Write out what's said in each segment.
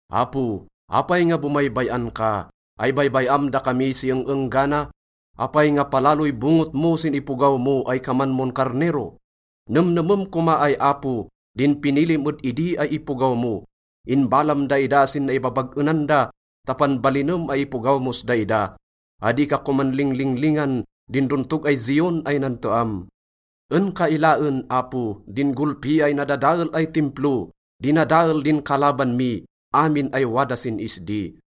Apo, apay nga bomaybay-an ka? Ay baybay-am dakami si eng-enggana? Apay nga palaloy bonget mo sin ipogaw mo ay kaman mon karnero? Nemnemem koma ay Apo din pinilim ed idi ay ipogaw mo. Inbalam daida sin naibabag-enan da ta panbalinem ay ipogaw mos daida. Adi ka koman linglinglingan din dontog ay Zion ay nanteam. En ka ilaen, Apo, din golpi ay nadadael ay Timplo. Dinadael din kalaban mi amin ay wada sin isdi.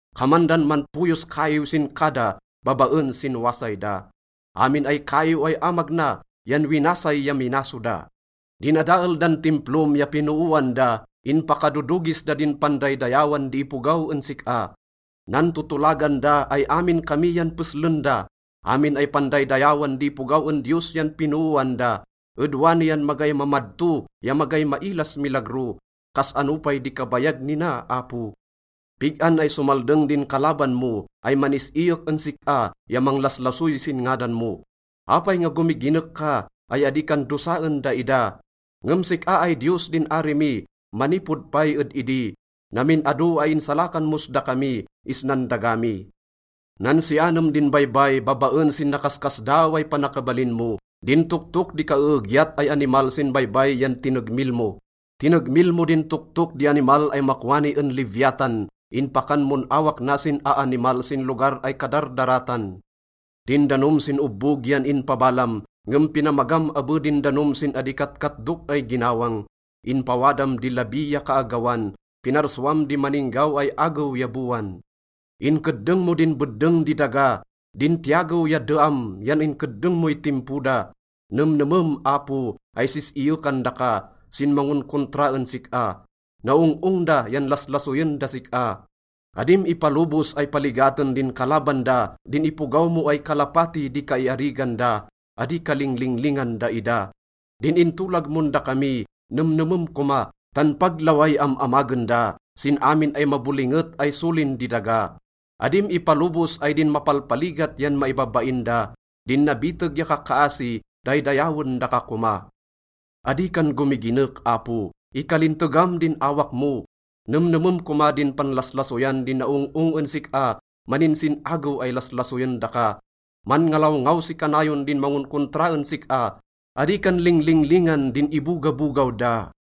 Kaman dan manpoyos kaiw sin kada babaen sin wasay da. Amin ay kaiw ay amag na yan winasay ya minaso da. Dinadael dan Timplom ya pinooan da, inpakadodogis da din pandaydayawan di ipogaw en sik-a. Nantotolagan da ay amin kami yan peslen da, amin ay pandaydayawan di ipogaw en Diyos yan pinooan da. Ed wani yan magay mamadto ya magay mailas milagro, kas-ano pay di kabayag nina, Apo? Pig-an ay somaldeng din kalaban mo ay manis-iyek en sik-a ya manglaslasoy sin ngadan mo? Apay nga gomiginek ka ay adi kan dosaen daida? Ngem sik-a ay Diyos din ari mi manipod pay ed idi, namin ado ay insalakan mos dakami isnan daga mi. Nansianem din baybay babaen sin nakaskasdaaw ay panakabalin mo. Din toktok di kaeegyat ay animal sin baybay yan tinegmil mo. Tinegmil mo din toktok di animal ay makwani en Leviatan, inpakan mon awak na sin aanimal sin lugar ay kadardaratan. Din danom sin obbog yan inpabalam, ngem pinamagam abe din danom sin adi katkatdok ay ginawang. Inpawadam di labi ya kaagawan, pinarsuam di maninggaw ay agew ya bowan. Inkeddeng mo din beddeng di daga, din tiyagew ya deam yan inkeddeng moy timpo da. Nemnemem, Apo, ay sis-iyekan daka sin mangonkontra en sik-a. Naong-ong da yan laslasoyen das sik-a. Adim ipalobos ay paligaten din kalaban da din ipogaw mo ay kalapati di kaiarigan da, adi ka linglinglingan daida. Din intolag mon dakami, nemnemem koma, tan pag laway am-amagen da sin amin ay mabolinget ay solin di daga. Adim ipalobos ay din mapalpaligat yan maibabain da, din nabiteg ya kakkaasi, daydayawen daka koma. Adi kan gomiginek, Apo, ikalintegam din awak mo! Nemnemem koma din panlaslasoyan di naong-ong en sik-a, maninsin-agew ay laslasoyen daka. Manngalawngaw si kanayon din mangonkontra en sik-a, adi kan linglinglingan din ibogabogaw da.